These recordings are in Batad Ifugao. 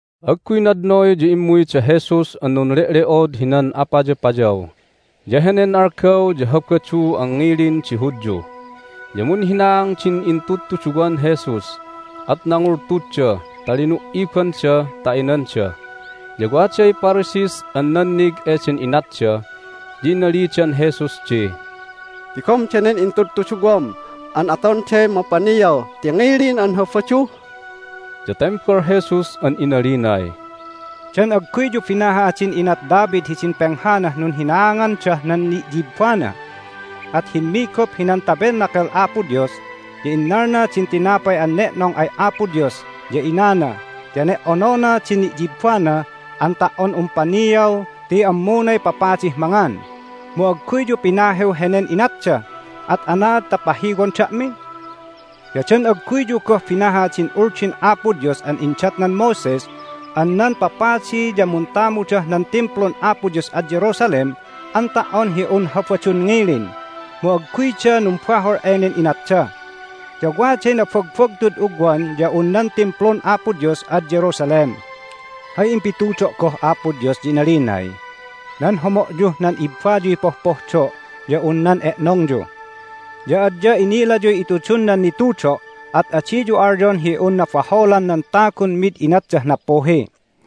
Agguy nadnoy ya immuy da Jesus an nunle'le'od hinan apayapayaw, ya henen algaw ya Habadu an ngilin di Hudyu. Ya munhinaang din intudtuduwan Jesus, at nangultudda ta linu"ibanda ta inanda. Ya waday Pharisees an nannig eden inatda, ya inalidan Jesus di, "Tigom danen intudtuduwam an atonday mapaniaw ti ngilin an Habadu!" Ya tembal Jesus an inalinay, "Dan agguyyu binaha din inat David hidin penghanah nunhinaangandah nan ni'yibbana? At himmigup hinan Tabernacle Apo Dios, ya innalna din tinapay an ne'nong ay Apo Dios, ya inana, ya ne"onona din ni'yibbana an ta"on un paniaw ti ammunay papadih mangan. Mu agguyyu pinahiw henen inatda, at anaad ta pahiwon da'mi? Ya dan agguyyu goh binahah din Uldin Apo Dios an indatnan Moses an nan papadi ya muntamudah nan Timplun Apo Dios ad Jerusalem an ta"on hi un Habadun ngilin, mu agguyda numbahol enen inatda. Ya waday nabagbagtud ugwan ya un nan Timplun Apo Dios ad Jerusalem! Hay impitudo' goh Apo Dios ya inalinay, Nan homo'yuh nan ibbayuy pohpohdo' ya un nan e'nongyu. Ya adya inilayuy itudun nan nitudo', at adiyu alyon hi un nabaholan nan tagun mid inatdah nappuhi.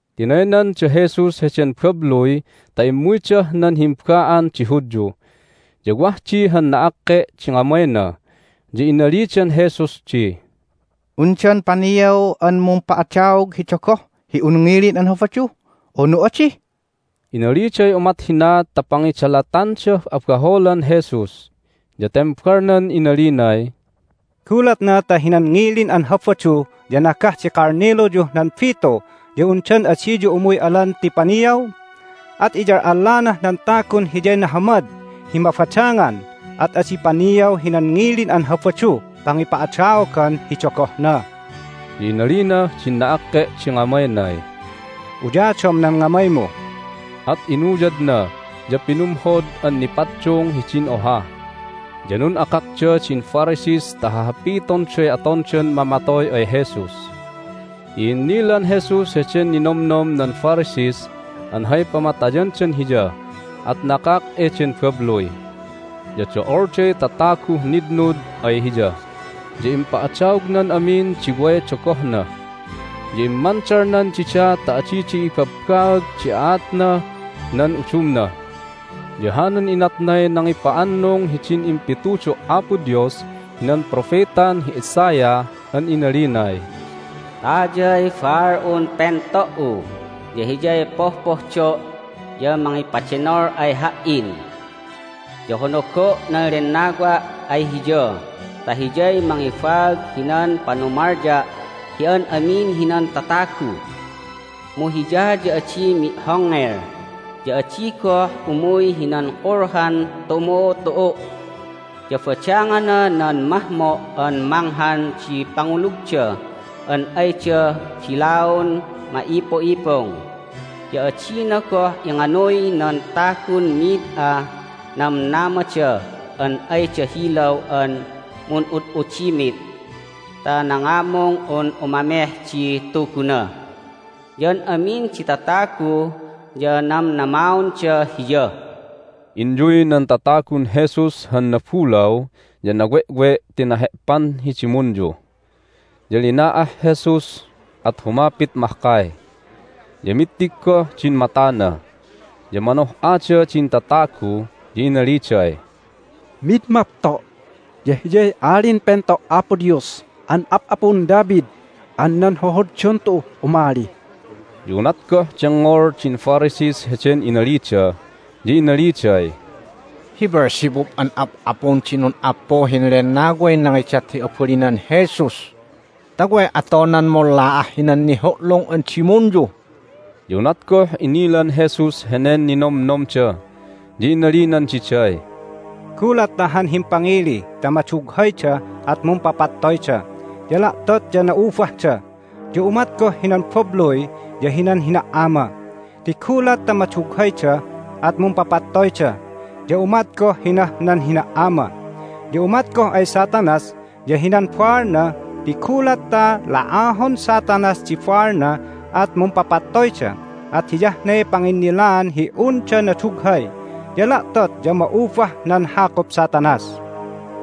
Tinaynan da Jesus heden babluy ta immuydah nan himba'an di Hudyu. Ya wah di han na'akke' di ngamayna, ya inalidan Jesus di, "Undan paniaw an mumpa'adaog hi dogoh hi un ngilin an Habadu, unu adi?" Inaliday umat hina ta pangidalatandah abaholan Jesus. Ya tembalnan inalinay, "Gulatna ta hinan ngilin an Habadu ya nagah di kalniluyuh nan bitu ya undan adiyu umuy alan ti paniaw? At iyal'allanah nan tagun hiyay nahamad hi mabadangan, at adi paniaw hinan ngilin an Habaduh pangipa'adaogan hi dogohna." Ya inalinah din na'akke' di ngamaynay, "Uyadom nan ngamaymu." At inuyadna, ya pinumhod an nipaddung hidin oha! Ya nun'akakda din Pharisees ta hahapitonday atondan mamatoy ay Jesus. I'innilan Jesus heden ninomnom nan Pharisees an hay pamatayandan Hiya, at nakak eden babluy. Ya do'olday tataguh nitnud ay Hiya, ya impa'adaognan amin di way dogohna. Ya immandalnan dida ta adida ibabbaag di aatnah nan udumna. Ya hanan inatnay nangipa'annung hidin impitudo' Apo Dios hinan propetan hi Isaiah an inalinay, "Tayay baal'un pento"u, ya Hiyay pohpohdo' ya mangipadenol ay Ha"in. Ya honogo' nan Lennawa' ay Hiya ta Hiyay mangibaag hinan panumalya' hi an amin hinan tatagu. Mu Hiya ya adi mi'hongngel, ya adi goh umuy hinan kulhan tumu'utu'u'. Ya badangana nan mahmo' an manghan di pangulugda an ayda bilaun ma'ipu'ipung, ya adina goh inganuy nan tagun mid ah namnamada an ayda hilaw an mun'ud'udimit ta nangamung un umameh di Tuguna. Ya an amin di tatagu ya namnamaonda Hiya." Inyuy nan tatagun Jesus han nabulaw ya nawe'we' ti nahe'pan hi dimunyu. Ya lina'ah Jesus, at humapit mahkay, ya mittig goh din matana. Ya manoh'ada din tatagu, ya inaliday, "Mid mapto' ya Hiyay Alin Pento' Apo Dios an ap'apun David an nan hohoddon tu'uh umali!" Ya unat goh dengngol din Pharisees heden inalida ya inaliday, "Hi Beelzebub an ap'apun di nun'appuhin lennaway nangidat hi abalinan Jesus ta way atonan munla'ah hinan nihu'lung an dimunyu!" Ya unat goh inilan Jesus henen ninomnomda ya inalinan diday, "Gulat ta han himpangili ta madughayda at mumpapattoyda, ya la'tot ya na'ubahda. Ya umat goh hinan babluy ya hinan hina"ama, ti gulat ta madughayda at mumpapattoyda, ya umat goh hinah nan hina"ama. Ya umat goh ay Satanas ya hinan baalna ti gulat ta la'ahon Satanas di baalna at mumpapattoyda, at hiyah ne panginnilaan hi unda nadughay, ya la'tot ya ma'ubah nan hakup Satanas.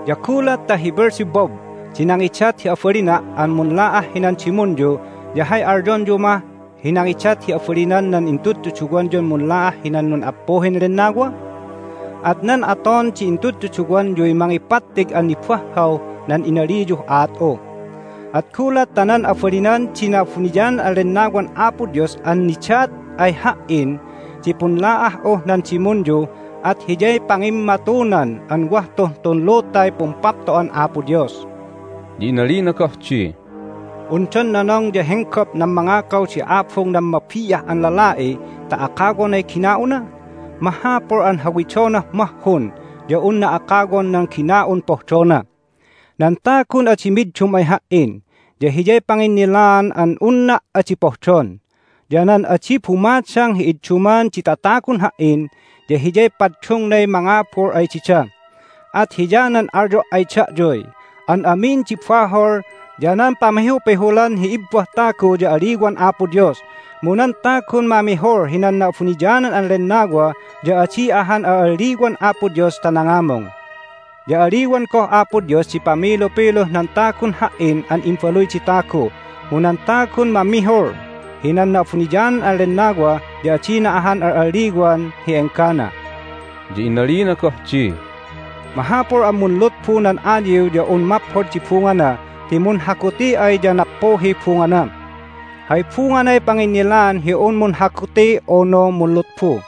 Ya gulat ta hi Beelzebub di nangidat hi abalina' an munla'ah hinan dimunyu ya hay alyonyu mah hi nangidat hi abalinan nan intudtuduwanyun munla'ah hinan nun'appuhin lennawa? At nan aton di intudtuduwanyuy mangipattig an nibahhaw nan inaliyuh aat'u. At gulat ta nan abalinan di Na'abuniyanan an Lennawan Apo Dios an nidat ay Ha"in di punla'ah'uh nan dimunyu at hiyay pangimmatunan an wah tuh tun lutay Pumpapto'an Apo Dios." Ya inalina goh di, "Undan nonong ya henggop nan mangakaw di abung nan mabi'ah an lala'i ta akawonay gina'una? Mahapul an hawidonah mahhun ya unna akawon nan gina'un pohdona. Nan tagun adi middum ay Ha"in ya hiyay panginnilaan an unna' adi pohdon. Ya nan adi bumadang hi idduman di tatagun Ha"in ya hiyay paddungnay mangabul ay dida. At hiyanan alyo' ay da'yuy, An amin di bahol ya nan pamihupihulan hi ibbah tagu ya aliwan Apo Dios. Mu nan tagun mamihul hinan Na'abuniyanan an Lennawa ya adi ahan al'alliwan Apo Dios ta nangamung. Ya aliwan goh Apo Dios di pamilupiluh nan tagun Ha"in an Imbaluy di Tagu, mu nan tagun mamihul hinan Na'abuniyanan an Lennawa ya adina ahan al'alliwan hi enggana." Ya inalina goh di, "Mahapul an munlutbu nan ayiw ya un maphod di bungana ti munhaguti ay ya nappuhiy bungana. Hay bunganay panginnilaan hi un munhaguti unu munlutbu.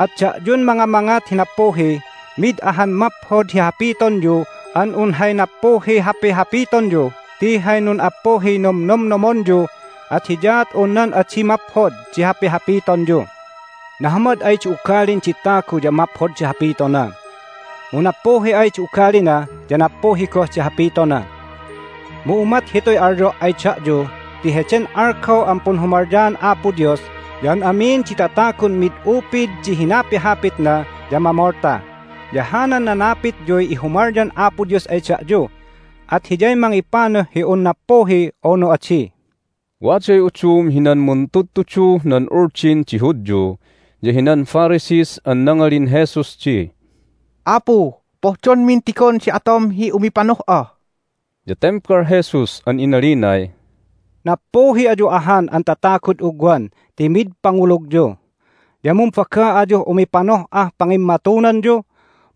At da'yun mangamangat hi nappuhi, mid ahan maphod hi hapitonyu an un hay nappuhiy hapihapitonyu ti hay nun'appuhiy nomnomnomonyu, at hiyaat un nan adi maphod di hapihapitonyu. Nahamad ay di ugalin di tagu ya maphod di hapitona, mu nappuhi ay di ugalina ya nappuhi goh di hapitona. Mu umat hituy alyo' ay da'yu ti heden algaw an punhumalyaan Apo Dios ya an amin di tatagun mid upid di hinapihapitna ya mamolta, ya hanan nanapityuy ihumalyan Apo Dios ay da'yu, at Hiyay mangipanuh hi un nappuhi unu adi." Waday udum hinan muntudtuduh nan Uldin di Hudyu ya hinan Pharisees an nangalin Jesus di, "Apu, pohdonmin tigon di atom hi umipanoh'a." Ya tembal Jesus an inalinay, "Nappuhi ayu ahan an tatagud ugwan ti mid pangulugyu! Ya mumbaga ayuh umipanoh'ah pangimmatunanyu,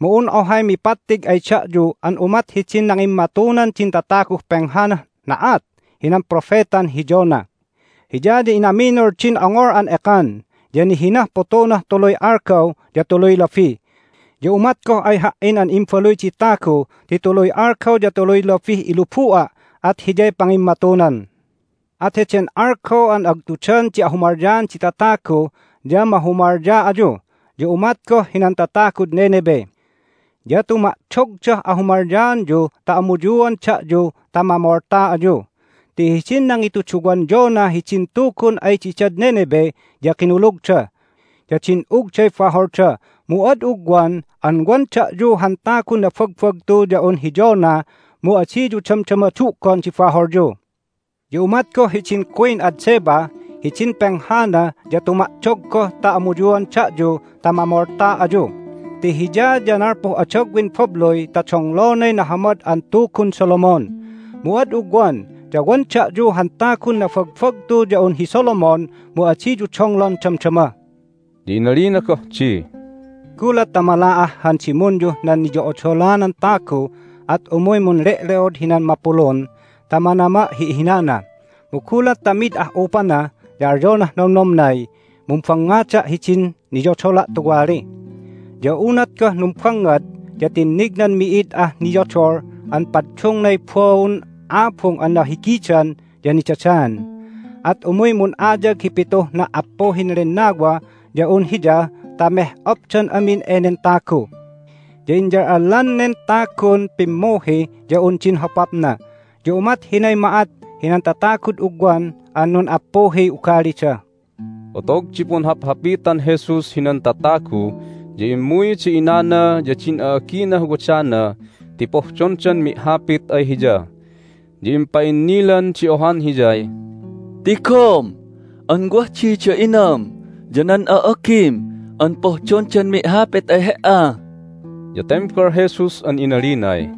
mu un ohay mipattig ay da'yu an umat hidin nangimmatunan din tataguh penghanah na'at hinan propetan hi Jonah. Hiya ya inaminul din ongol an ekan, ya nihinah putunah tuluy algaw ya tuluy labi. Ya umat goh ay Ha"in an Imbaluy di Tagu ti tuluy algaw ya tuluy labih ilubu'a', at hiyay pangimmatunan. At heden algaw an agtudan di ahumalyaan di tatagu ya mahumalya ayu, ya umat goh hinan tatagud Nineveh. Ya tuma'dogdah ahumalyaanyu ta amuyuan da'yu ta mamolta ayu. Ti hidin nangituduwan Jonah hidin Tugun ay didad Nineveh ya kinulugda, ya din'ugday baholda. Mu ad ugwan an wan da'yu han tagun nabagbagtu ya un hi Jonah, mu adiyu damdama du'gon di baholyu! Ya umat goh hidin queen ad Sheba hidin penghana ya tuma'dog goh ta amuyuan da'yu ta mamolta ayu. Ti hiya ya nalpuh adagwin babluy ta donglonay nahamad an tugun Solomon. Mu ad ugwan ya wan da'yu han tagun nabagbagtu ya un hi Solomon, mu adiyu donglon damdama!" Ya inalina goh di, "Gulat ta mala'ah han dimunyuh nan niyo'odolanan tagu at umuy munle'le'od hinan mapulun ta manama' hi ihinana. Mu gulat ta mid ah'upana ya alyonah nomnomnay, Mumbangngada' hidin niyodola' tuwali! Ya unat goh numbangngad ya tinnignan mi'id ah niyodol an paddungnay baun abung an nahigidan ya nidadaan. At umuy mun'ayag di pituh na"appuhin lennawa ya un hiya ta meh'opdan amin enen tagu. Ya inyal'allan nen tagun pimmuhi ya un din hopapna! Ya umat hinay ma'at hinan tatagud ugwan an nun'appuhiy ugalida." Otog di punhaphapitan Jesus hinan tatagu ya immuy da inana ya din a'aginah wadana ti pohdondan mi'hapit ay Hiya. Ya impa'innilan di ohan Hiyay, "Tigom an wah di da inam ya nan a'agim an pohdondan mi'hapit ay He"a." Ya tembal Jesus an inalinay,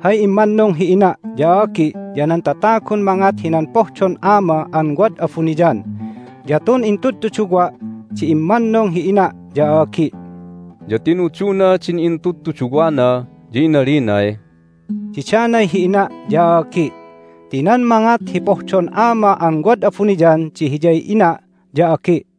"Hay immannung hi ina' ya a'agi ya nan tatagun mangat hinan pohdon Ama an wad abuniyan. Ya tun intudtuduwa' di immannung hi ina' ya a'agi'." Ya tinuduna din intudtuduwana, ya inalinay, "Didanay hi ina' ya a'agi'! Ti nan mangat hi pohdon Ama an wad abuniyan di hiyay ina' ya agi'."